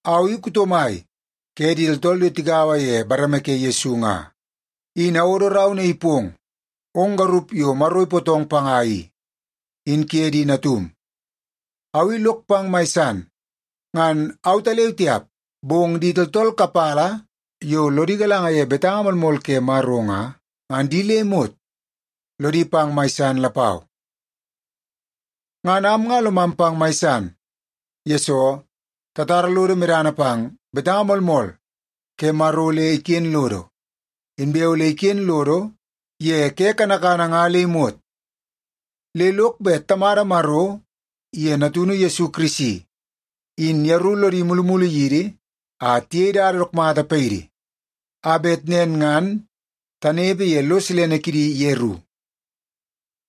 Au i kuto mai ke di tooltool yo tigaua ye bareme ke Yesu nga, in awodo rau naii pong ong garup yo Maro ipootong panga i, in kuye di natum. Au i lok pang mai san. Ngan autaleu tiap, bong di tooltool kapala yo lodi galanga ye betanga moolmool ke Maro nga, ngan di le imot lodi pang mai san lapau. Ngan am nga lomam pang mai san, yesoo tatara lodo medana pang betanga moolmool ke Maro le iken lodo, inbe ole iken lodo ye ke kanakana nga le imot. Le lok bet Tamada Maro iye Natunu Yesu Kirisi, in yeru lodi mulumulu yidi a tiyei dada dook mata paidi, a bet nen ngan tanepe ye lo silene kidi yeru.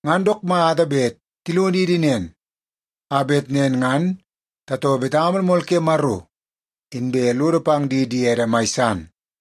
Ngan dook mata bet tilonidi nen, a bet nen ngan tatoo betanga moolmool ke Maro, inbe lodo pang di diede mai san.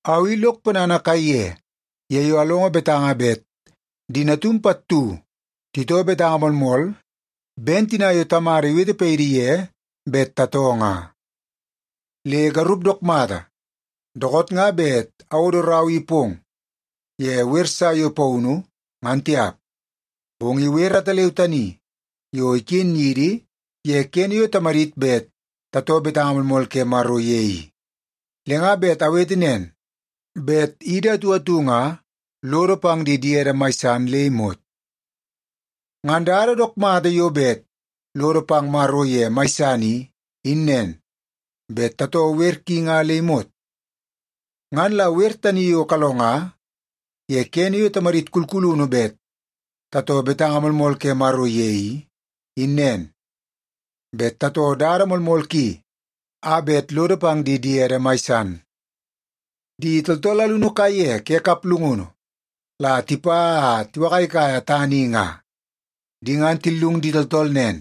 Au i lok ponana kaiye ye yo alongo betanga bet di natum pattu titoo betanga moolmool ben tina yo Tamada iwete paidi ye bet tatoo nga. Le garup dook mata, dookoot nga bet awodo rau i pong ye wer sa yo paunu, ngan tiap. Bong i wer ataleu tani yo iken yidi ye kene yo tamadit bet tatoo betanga moolmool ke Maro ye i. Le nga bet awete nen, bet idi atu atu nga lodo pang di diede mai san le imot. Ngan dada dook mata yo bet lodo pang Maro ye mai san i, in nen, bet tatoo wer ki nga le imot. Ngan la wer tani yo kalonga ye kene yo tamadit kulkulunu bet tatoo betanga moolmool ke Maro ye i, in nen, bet tatoo dada moolmool ki a bet lodo pang di diede mai san. Di tooltool alunu kaiye ke kaplungunu la tipa a tiwakaikaia tana i nga. Di ngan tillung di tooltool nen,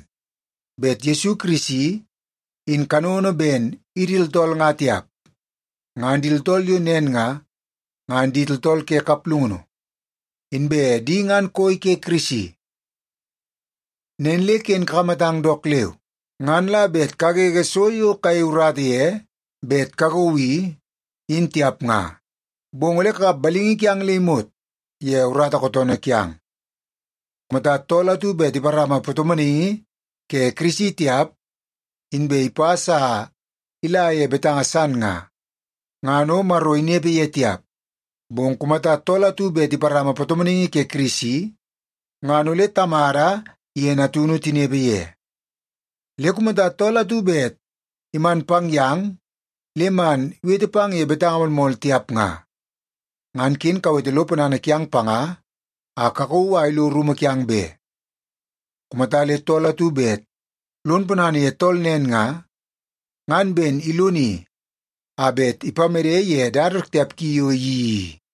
bet Yesu Kirisi in kanono ben idi tooltool nga tiap. Ngan di tooltool yo nen nga, ngan di tooltool ke kaplungunu, inbe di ngan koi ke Kirisi. Nen le ken kakamatang dook leu, ngan la bet kagege so yo kayei urata ye bet kakauu i, in tiap nga. Bong ole kakap balingi kiang le imot ye urata kootoonoo kiang. Kumata tool atu bet iparama patomonaingi ke Kirisi tiap, inbe ipas a ila ye betanga san nga, ngan o Maro inepe ye tiap. Bong kumata tool atu bet iparama patomonaingi ke Kirisi, ngan ole Tamada iye Natunu tinepe ye. Le kumata tool atu bet iman pang yang le man iwete pang ye betanga moolmool tiap nga, ngan ken kawete lo ponana kiang panga a kakauu a ilo rumu kiang be. Kumata le tool atu bet lon ponana ye tool nen nga, ngan ben iloni a bet ipamede ye dada dook tiap ki yo iyeii i.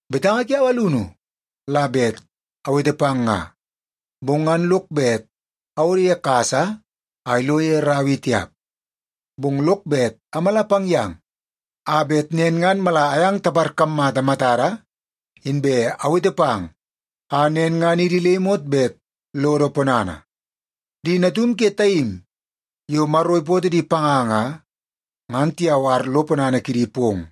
Betanga kiau alunu la bet awete pang nga, bong ngan lok bet awodo ye kasa a ilo ye rau i tiap. Bong lok bet amala pang yang a bet nen ngan mala ayang taparkammata matada, inbe awete pang a nen ngan idi le imot bet lodo ponana. Di natum ke taim yo Maro ipootoo di panga nga, ngan tiyawar lo ponana kidi pong.